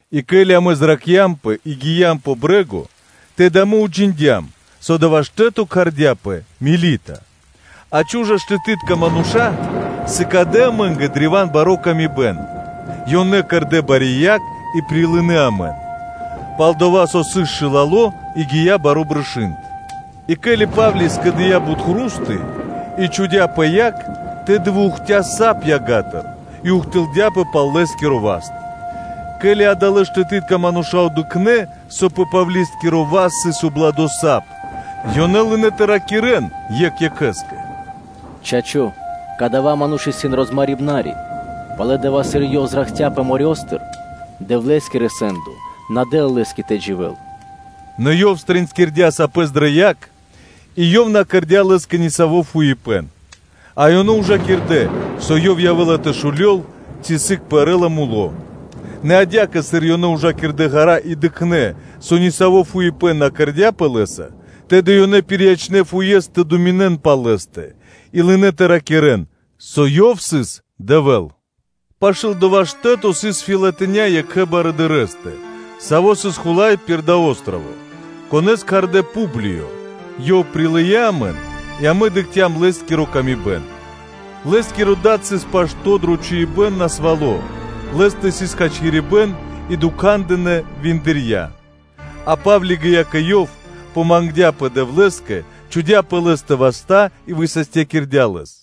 И ке́ли амэ зракхцямпэ и гиям пэ брэ́го, тэды амэ уджиндям, со дава́ штэ́то кхардяпэ Мелита. А чу́жа штэтытка мануша́ сыкадэ амэ́нгэ древа́н бари пшалы́тко паты́в: ёнэ кэрдэ́ бари яг и прилынэ́ амэн, пал-дова́ со сыс шылало и гия́ баро́ брышы́нд. И ке́ли Па́вли скэдыя́ бут хру́сты (кусты) и чхудя́ пэ яг, тэды выухтя сап ягатыр и ухтылдяпэ пал лэ́скиро васт. Ке́ли адалэ́ штэтытка мануша́ дыкхнэ́, со пэ Павли́скиро васт сыс убладо сап, ёнэ лынэ́ тэ ракирэ́н екх екхэ́скэ: “Чачо́, кадава́ ману́ш исын розмарибнари, пало́ дава́, сыр ёв зракхцяпэ морёстыр (дэрьявэстыр), Дэвлэ́скиро сэ́ндо на дэ́ла лэ́скэ тэ дживэ́л.” Нэ ёв стринскирдя пэстыр сапэс дрэ яг, и ёв на кэрдя́ лэ́скэ нисаво́ фуипэ́н. А ёнэ ужакирдэ, со ёв явэ́ла тэ шулёл ци сыг пэрэ́ла муло́; нэ адя́кэ, сыр ёнэ ужакирдэ ґара́ и дыкхнэ́, со нисаво́ фуипэ́н на кэрдя́пэ лэ́са, тэды ёнэ пириячнэ фуес тэ думинэн пал лэ́стэ, и лынэ́ тэ ракирэ́н, со ёв сыс Дэвэ́л. Пашы́л дова́ штэ́то сыс фэлатиня́ екхэ барыдырэстэ, саво́ сыс хула́й пир дава́ о́строво (джип), конэ́с кхардэ́ Публиё; ёв прилыя́ амэн и амэ дыкхцям лэ́скиро лачхо́ ило́. Лэ́скиро дад сыс пашто́ дро чхуибэ́н насвало́, лэ́стэ сыс хачкирибэ́н и дукхандынэ виндырья; а Па́вли гия́ кэ ёв, помагдяпэ Дэвлэ́скэ, чхудя́ васта́ пэ лэ́стэ и высастякирдя́ лэс.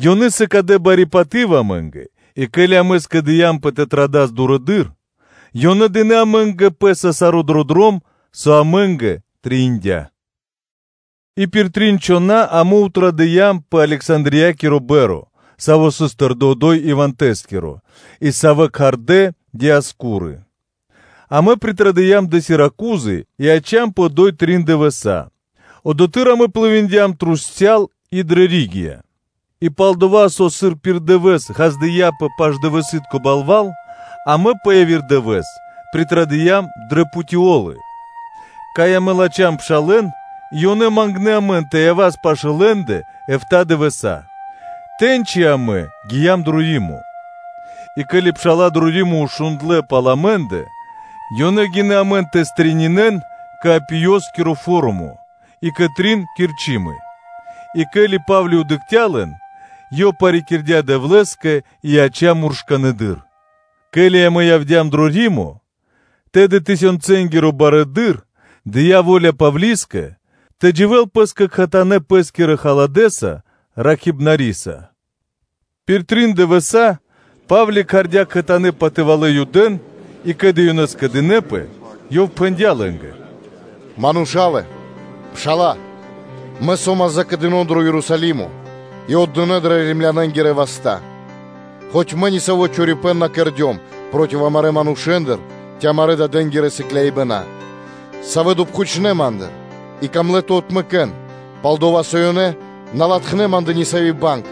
ёнэ сыкадэ бари паты́в амэ́нгэ, и ке́ли амэ скэдыямпэ тэ традас дурыдыр, ёнэ дынэ́ амэ́нгэ пэ́са дро дром саро́, со амэ́нгэ трэиндя́. И пир трин чхона́ амэ традыям пэ Александриякири па́рма, сави́ сыс тэрды одо́й ивантэ (зимакиро) и сави́ кхардэ́ Диаскуры. Амэ явдя́м дрэ Сиракузы, и яцямпэ одо́й трин дывэса́. Одотхы́р амэ плывиндям (дыя́м пли́ма) трусця́л и дрэ Ригия, и пал-дова́ со, сыр пир дывэ́с ґаздыя́пэ паш-дывэсы́тко балва́л, амэ пэ яви́р дывэ́с затрадыям дрэ Путеолы, кай амэ латхям пшалэ́н, и ёнэ мангнэ́ амэн тэ явас пашы́л лэ́ндэ эфта́ дывэса́. Тэ́ньци амэ гиям дро Римо. И ке́ли пша́ла дро Римо шундлэ́ пал амэ́ндэ, ёнэ гинэ́ амэн тэ стрэнинэн кэ Апиёскиро Форумо и кэ Трин Кирчымы, а ке́ли Па́вли дыкхця́ лэн, ёв парикирдя Дэвлэ́скэ и яця́ муршканэдыр. Ке́ли амэ явдя́м дро Римо, тэды тысёнцэнгиро барыдыро́ дыя́ во́ля Павлискэ тэ дживэ́л пэ́скэ кхэтанэ́ бахталэдыр пэ́скирэ халадэса-ракхибнариса. Пир трин дывэса́ Па́вли кхардя́ кхэтанэ́ патывалэ́ Юдэ́н, и, ке́ли ёнэ скэдынэ́пэ, ёв пхэндя́ лэ́нгэ: “Мануша́лэ-Пшала́лэ! Мэ со́мас закэдыно дро Ерусалимо и отдыно́ дрэ Римлянэнгирэ васта́, хоць мэ нисаво́ чорипэ́н на кэрдём проти амарэ́ манушэ́ндэ ци амарэ́ дадэнги́рэ сыкляибэна; савэ́ допхучнэ ма́ндыр и камлэ́ тэ отмэкэн, пал-дова́ со ёнэ на латхнэ́ пал ма́ндэ нисави́ банг,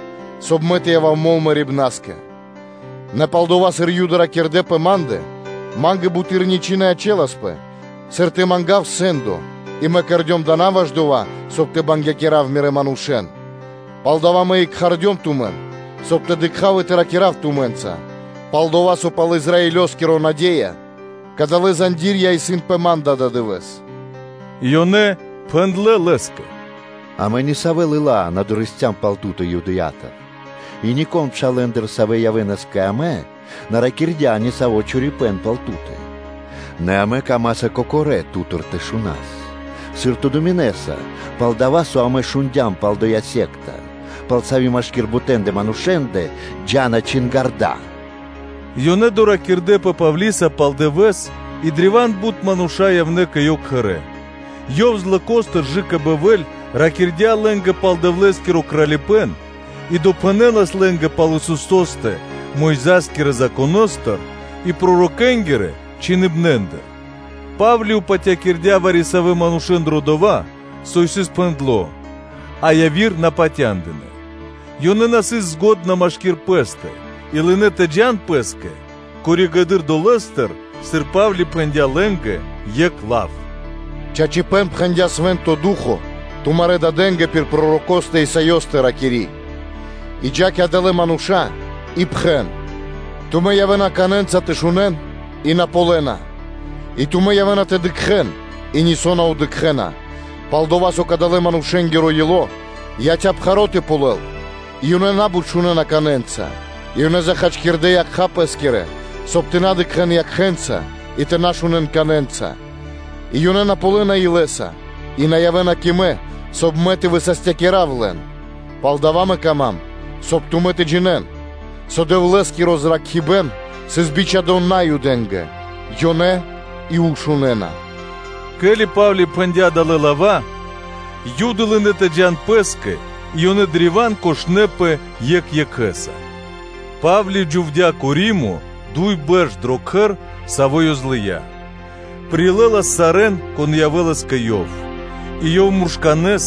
соб (кай) мэ тэ явав мол мэрибна́скэ. Нэ палдова́, сыр Юды ракирдэ́ пэ ма́ндэ, ма́нгэ буты́р ничы́ на ячэласпэ, сыр тэ мангав сэ́ндо, и мэ кэрдём дава́ на ваш дова́, соб (кай) тэ бангякирав мирэ́ манушэ́н. Палдава́ мэ и кхардём тумэн, соб (кай) тэ дыкха́в и тэ ракира́в тумэ́нца; пал-дова́ со пал Израилёскири наде́я кадалэ́ зандирья́ (цэ́пи) исын пэ ма́ндэ ададывэ́с.” И ёнэ пхэндлэ́ лэ́скэ: “Амэ нисавэ лыла́ на дорэсцям пал ту́тэ Юдэя́тыр, и нико́н пшалэ́ндыр, савэ́ явэ́нас кэ амэ, на ракирдя́ нисаво́ чорипэ́н пал ту́тэ. Нэ амэ камаса кокорэ́ ту́тыр тэ шунас, сыр ту думинэса, пал-дова́ со амэ шундя́м пал дова́ сыкляибэн, пал саво́ машки́р бутэндэ манушэндэр джа́на чингарда́.” Ёнэ доракирдэпэ Павлиса пал дывэ́с, и древа́н бут мануша́ явнэ́ кэ ёв кхэрэ́; ёв злокостыр кэ/жы́ко бэльвэ́ль ракирдя́ лэ́нгэ пал Дэвлэ́скиро Кралипэ́н, и допхэнэлас лэ́нгэ пал Исусо́стэ Мойза́скирэ Законо́стыр, и пророкэ́нгирэ чхиныбнастыр. Па́вли упатякирдя вари-савэ́н манушэ́н дро дова́, со исын пхэндло́, а яви́р на патяндынэ́. Ёнэ на сыс дрэ екх годы́ машки́р пэ́стэ, и лынэ́ тэ джа́н пэ́скэ коригэды́р долэ́стыр, сыр Па́вли пхэндя́ лэ́нгэ екх лав: “Чачипэ́н пхэндя́ Свэ́нто Ду́хо (Фа́но) тумарэ́ дадэ́нгэ пир пророкостэ Исаёстэ, ракири́: “И джа́ кэ адалэ́ мануша́ и пхэн: ‘Тумэ́ явэ́на канэнца тэ шунэ́н и на ґалёна, и тумэ́ явэ́на тэ дыкхэ́н и нисо́ на дыкхэ́на. Пал-дова́ со кадалэ́ манушэ́нгиро ило́ яця́ пхаро́ тэ ґалёл, и ёнэ на́бут шунэ́на канэнца, и ёнэ зачхакирдэ якха́ пэ́скирэ, соб (кай) тэ на дыкхэ́н якхэ́нца и тэ на шунэ́н канэнца, и ёнэ на ґалёна илэ́са и на явэ́на кэ Мэ, соб (кай) Мэ тэ высастякирав лэн’. Палдава́ мэ кама́м, соб (кай) тумэ́ тэ джинэ́н, со Дэвлэ́скиро зракхибэ́н сыс бичхадо́ Наюдэ́нгэ; ёнэ и ушунэна.” Ке́ли Па́вли пхэндя́ далэ́ лава́, Юды лынэ́ тэ джа́н пэ́скэ, и ёнэ древа́н кошнэпэ екх екхэ́са. Па́вли дживдя́ кэ Римо дуй бэрш дро кхэр, саво́ ёв злыя́, прилэлас сарэ́н, кон явэ́лас кэ ёв, и ёв муршканэ́с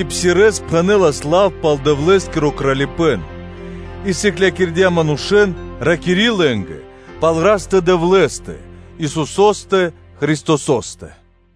и псирэ́с (откэрдэ́с) пхэнэлас лав пал Дэвлэ́скиро Кралипэ́н и сыклякирдя́ манушэ́н, ракири́ лэ́нгэ пал Растэ-Дэвлэ́стэ, Исусо́стэ Христосо́стэ.